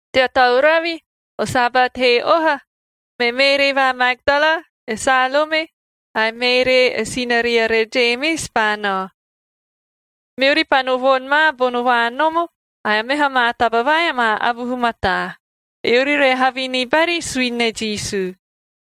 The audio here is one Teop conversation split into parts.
Tea tauravi, o Sabat he oha, me Meeree va Magdala, e Salome ae Meeree e sinariere Jemis paa nao, meori paa no voni ma bono vaanomo ae meha maa taba vai amaa avuhu mataa, eori re havi ni bari suini ne Jisu.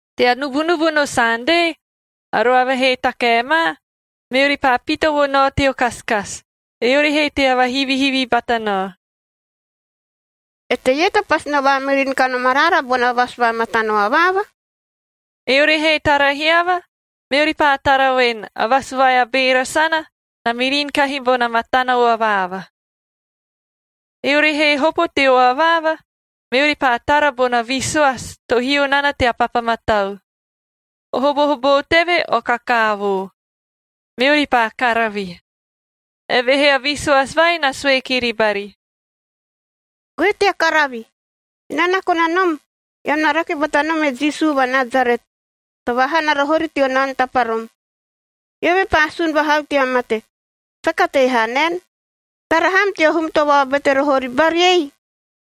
Tea nubunubu no Sande, a roava he takae ma, meori paa pita vo nao teo kasikasi, eori he tea vahivihivi bata nao, “Eteie to pasi no vaamirin kanom araara bona vasu va matano avaava?” Eori he tara hiava, meori paa tara voen, a vasu vai a beera sana, na mirin kahi bona matano avaava. Eori he hopo teo avaava, meori paa tara bona visoasia to hio nana tea papa matau. O hobohoboo teve o kakaavoo. Meori paa karavi. Evehee a visoasi vai na sue kiri bari, “Goe tea karavi. Enaa na kona nom, eam na rake bata nom e Jisu va Nasaret to vaahana roho ori teo naono taparom. Eove paa sun vahau tea mate. Saka tei haa naen! Tara ham teo hum to vaobete roho ori bari ei.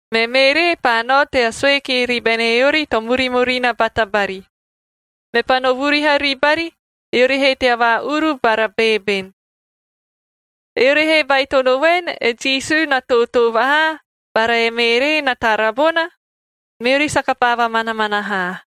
Me Meeree paa nao tea sue kiri bene eori to murimurina bata bari. Mepaa no vuriha ribari, eori he tea vaa-uru bara beeben. Eori he baitono voen e Jisu na tootoo vahaa bara e Meeree na tara bona, meori saka paa vamanamana haa.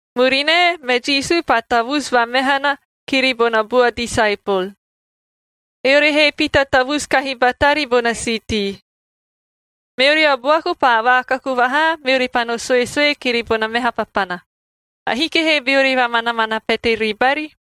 Murinae, me Jisu paa tavusu vamehanae kiri bona bua disaepol, eori he pita tavusu kahi batari bona siitii. Meori a buaku paa vaakaku vahaa, meori paa no suesue kiri bona meha papana. Ahiki he beori vamanamana pete ribari.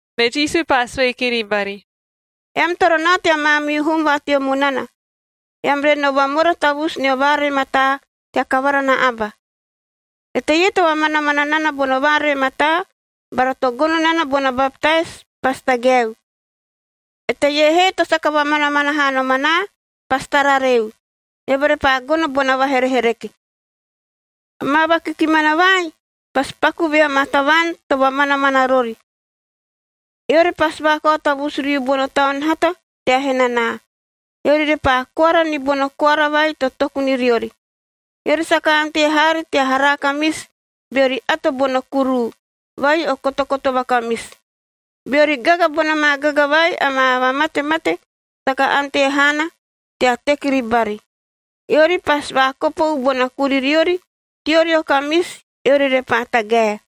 Me Jisu paa sue kiri bari, “Eam toro nao tea maamihu hum va teo munana, eam re no vamora tavusu nio vaaree mataa tea kavara na aba. Eteie to vamanamana nana bono vaaree mataa bara to gono nana bona baptais, pasi tagaeu. Eteie he to saka vamanamana haa nom anaa pasi tarareu, eove repaa gono bona vaherehereke. Amaa vakikimana vai pasi pakuu vea maa tavaan to vamanamana rori: Eori pasi vaakao tavusu riu bono taun hata tea henanaa. Eori repaa koara ni bono koara vai to toku ni riori. Eori saka ante haari tea haara kamisi beori ato bono kuruu vai o kotokoto vakamisi. Beori gaga bona maa gaga vai amaa vamatemate, saka ante haana tea teki ribari. Eori pasi vaakopou bona kuririori teori o kamisi, eori repaa tagae.”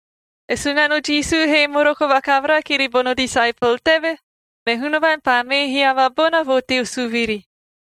E Sunano Jisu he moroko vakavara kiri bono disaepol teve, me Hunavaan paa mee hiava bona vo teo suviri,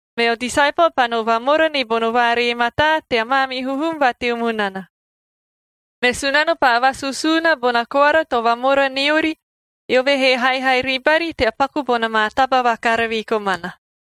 Meo disaepol paa no vamora ni bono vaaree mataa tea maamihu hum va teo munana. Me Sunano paa vasusuuna bona koara to vamora niori, eove he haihai ribari tea paku bona maa taba vakaravi komana.]